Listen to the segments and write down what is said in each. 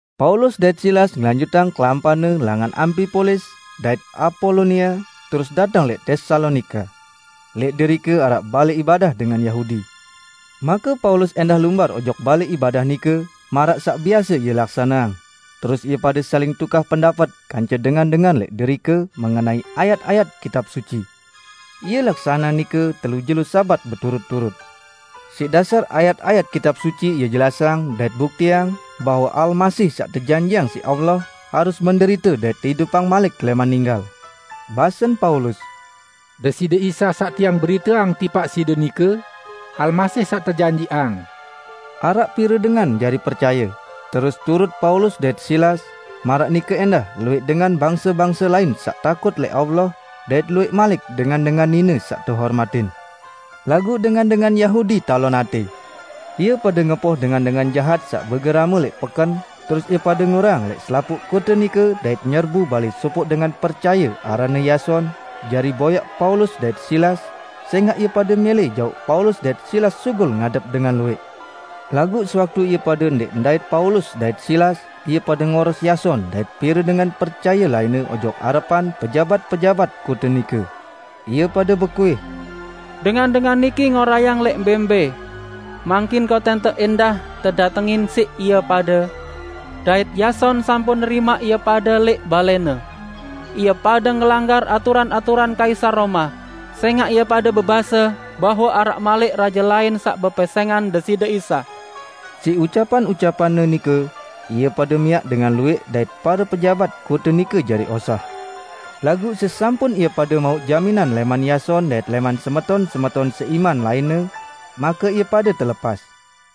Paulus dait Silas ngelanjutang kelampanne langan Ampipolis, dait Apolonia, terus dateng lẽq Tesalonika. Lẽq derike araq balẽ ibadah dengan Yahudi. Make Paulus ẽndah lumbar ojok balẽ ibadah nike -- maraq saq biase ie laksaneang -- terus ie pade saling tukah pendapet kance dengan-dengan lẽq derike mengenai ayat-ayat Kitab Suci. Ie laksaneang nike telu jelo Sabat beturut-turut. Siq dasar ayat-ayat Kitab Suci ie jelasang dait buktiang bahwe Almasih saq tejanjiqang siq Allah harus menderite dait teidupang malik lẽman ninggal. Basen Paulus, "Deside Isa saq tiang beriteang tipaq side nike, Almasih saq tejanjiqang." Araq pire dengan jari percaye, terus turut Paulus dait Silas, maraq nike ẽndah luwẽq dengan bangse-bangse lain saq takut lẽq Allah, dait luwẽq malik dengan-dengan nine saq tehormatin. Laguq dengan-dengan Yahudi talon atẽ. Ie pade ngempoh dengan-dengan jahat saq begerame lẽq peken, terus ie pade ngorayang lẽq selapuq kote nike dait nyerbu balẽ sopoq dengan percaye aranne Yason, jari boyaq Paulus dait Silas, sẽngaq ie pade mẽlẽ jauq Paulus dait Silas sugul ngadep dengan luwẽq. Laguq sewaktu ie pade ndẽq ndait Paulus dait Silas, ie pade ngoros Yason dait pire dengan percaye lainne ojok arepan pejabat-pejabat kote nike. Ie pade bekuih, "Dengan-dengan niki ngorayang lẽq mbẽ-mbẽ! Mangkin kotente ẽndah tedatengin siq ie pade, dait Yason sampun nerimaq ie pade lẽq balẽne. Ie pade ngelanggar aturan-aturan Kaisar Roma, sẽngaq ie pade bebase bahwe araq malik raje lain saq bepesẽngan Deside Isa." Siq ucapan-ucapanne nike, ie pade miaq dengan luwẽq dait pare pejabat kote nike jari osah. Laguq sesampun ie pade mauq jaminan lẽman Yason dait lẽman semeton-semeton seiman lainne, make ie pade telepas.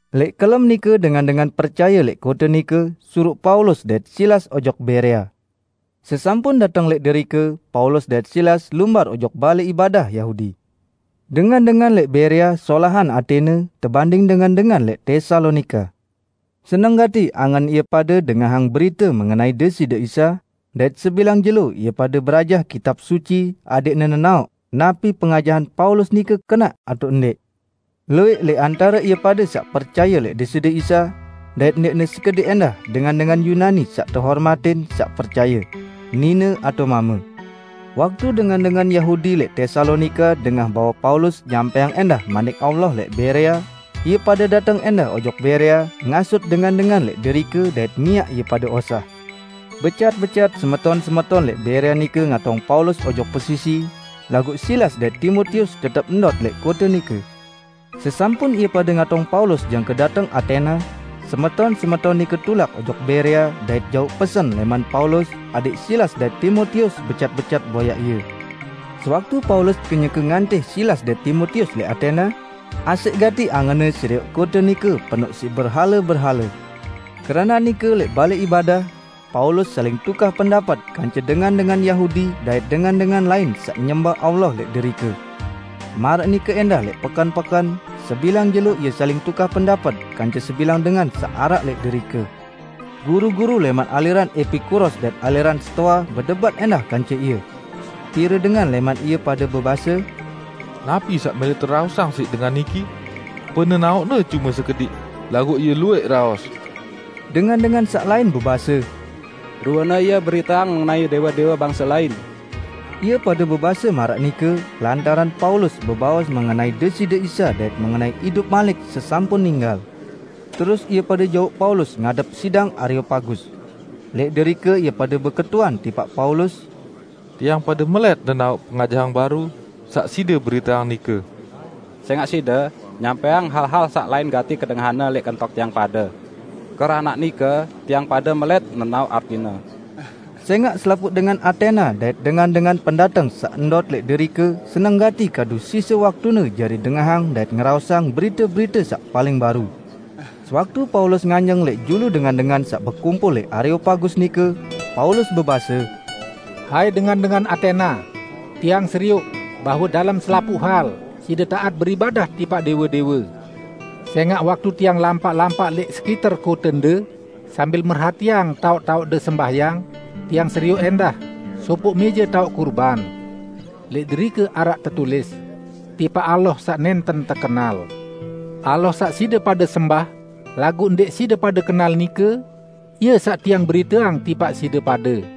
Lẽq kelem nike dengan-dengan percaye lẽq kote nike, suruq Paulus dait Silas ojok Berea. Sesampun dateng lẽq derike, Paulus dait Silas lumbar ojok balẽ ibadah Yahudi. Dengan-dengan lẽq Berea solahan atẽne tebanding dengan-dengan lẽq Tesalonika. Seneng gati angen ie pade dengahang berite mengenai Deside Isa, dait sebilang jelo ie pade berajah Kitab Suci adẽqne nenaoq napi pengajahan Paulus nike kenaq atao ndẽq. Luwẽq lẽq antare ie pade saq percaye lẽq Deside Isa, dait ndẽqne sekediq ẽndah dengan-dengan Yunani saq tehormatin saq percaye; nine atao mame. Waktu dengan-dengan Yahudi lẽq Tesalonika dengah bahwe Paulus nyampẽang ẽndah Manik Allah lẽq Berea, ie pade dateng ẽndah ojok Berea ngasut dengan-dengan lẽq derike dait miaq ie pade osah. Becat-becat semeton-semeton lẽq Berea nike ngatong Paulus ojok pesisi, laguq Silas dait Timotius tetep ndot lẽq kote nike. Sesampun ie pade ngatong Paulus jangke dateng Atena, semeton-semeton nike tulak ojok Berea dait jauq pesen lẽman Paulus adẽq Silas dait Timotius becat-becat boyaq ie. Sewaktu Paulus kenyeke ngantih Silas dait Timotius lẽq Atena, asẽq gati angenne serioq kote nike penoq siq berhale-berhale. Keranaq nike lẽq balẽ ibadah, Paulus saling tukah pendapet kance dengan-dengan Yahudi dait dengan-dengan lain saq nyembah Allah lẽq derike. Maraq nike ẽndah lẽq peken-peken, sebilang jelo ie saling tukah pendapet kance sebilang dengan saq araq lẽq derike. Guru-guru lẽman aliran Epikuros dait aliran Stoa bedebat ẽndah kance ie. Pire dengan lẽman ie pade bebase, "Napi saq mẽlẽ teraosang siq dengan niki? Penenaoqne cume sekediq, laguq ie luwẽq raos!" Dengan-dengan saq lain bebase, "Ruene ie beriteang mengenai dẽwe-dẽwe bangse lain." Ie pade bebase maraq nike, lantaran Paulus bebaos mengenai Deside Isa dait mengenai idup malik sesampun ninggal. Terus ie pade jauq Paulus ngadep sidang Areopagus. Lẽq derike ie pade beketuan tipaq Paulus, "Tiang pade melẽt nenaoq pengajahan baru saq side beriteang nike. Sẽngaq side nyampẽang hal-hal saq lain gati kedengahanne lẽq kentok tiang pade. Keranaq nike tiang pade melẽt nenaoq artine." ( Sẽngaq selapuq dengan Atena dait dengan-dengan pendateng saq ndot lẽq derike seneng gati kadu sise waktune jari dengahang dait ngeraosang berite-berite saq paling baru.) Sewaktu Paulus nganjeng lẽq julu dengan-dengan saq bekumpul lẽq Areopagus nike, Paulus bebase, "Hai dengan-dengan Atena! Tiang serioq bahwe dalem selapuq hal side taat beribadah tipaq dẽwe-dẽwe. Sẽngaq waktu tiang lampaq-lampaq lẽq sekiter kotende, sambil merhatiang taoq-taoqde sembahyang, tiang serioq ẽndah sopoq mẽje taoq kurban; lẽq derike araq tetulis, 'Tipaq Allah Saq Nẽnten Tekenal'. Allah saq side pade sembah laguq ndẽq side pade kenal nike, Ie saq tiang beriteang tipaq side pade.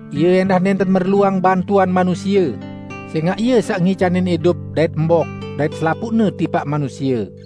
Ie ẽndah nẽnten merluang bantuan manusie, sẽngaq Ie saq ngicanin idup dait embok dait selapuqne tipaq manusie.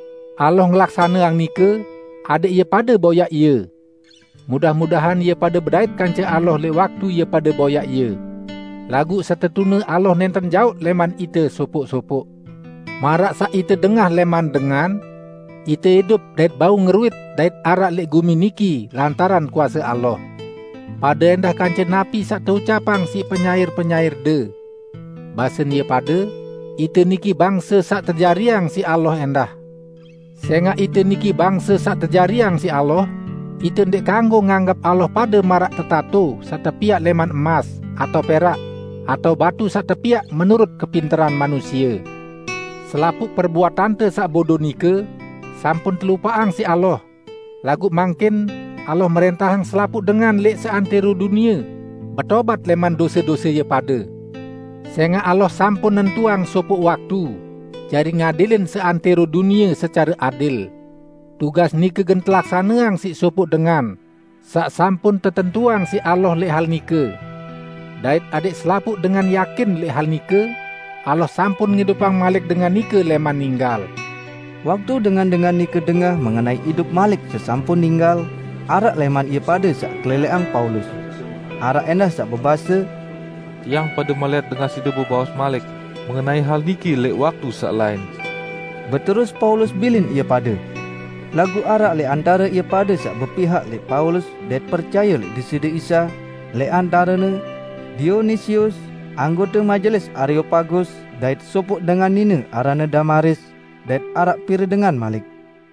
Allah ngelaksaneang nike adẽq ie pade boyaq Ie. Mudah-mudahan ie pade bedait kance Allah lẽq waktu ie pade boyaq Ie. Laguq setetune Allah nẽnten jaoq lẽman ite sopoq-sopoq. Maraq saq ite dengah lẽman dengan, 'Ite idup dait bau ngeruit dait araq lẽq gumi niki lantaran kuase Allah.' Pade ẽndah kance napi saq teucapang siq penyair-penyairde. Basen ie pade, 'Ite niki bangse saq tejariang siq Allah ẽndah.' Sẽngaq ite niki bangse saq tejariang siq Allah, ite ndẽq kanggo nganggep Allah pade maraq tetato saq tepiaq lẽman emas atao perak atao batu saq tepiaq menurut kepinteran manusie. Selapuq perbuatante saq bodo nike sampun telupaqang siq Allah, laguq mangkin Allah mrẽntahang selapuq dengan lẽq seantẽro dunie betobat lẽman dose-dose ie pade. Sẽngaq Allah sampun nentuang sopoq waktu jari ngadilin seantẽro dunie secare adil. Tugas nike gen telaksaneang siq sopoq dengan saq sampun tetentuang siq Allah lẽq hal nike. Dait adẽq selapuq dengan yakin lẽq hal nike, Allah sampun ngidupang malik dengan nike lẽman ninggal!" Waktu dengan-dengan nike dengah mengenai idup malik sesampun ninggal, araq lẽman ie pade saq kelelẽqang Paulus. Araq ẽndah saq bebase, "Tiang pade melẽt dengah side bebaos malik mengenai hal niki lẽq waktu saq lain." Beterus Paulus bilin ie pade. Laguq araq lẽq antare ie pade saq bepihak lẽq Paulus dait percaye lẽq Deside Isa, lẽq antarene: Dionisius, anggote majelis Areopagus dait sopoq dengan nine aranne Damaris, dait araq pire dengan malik.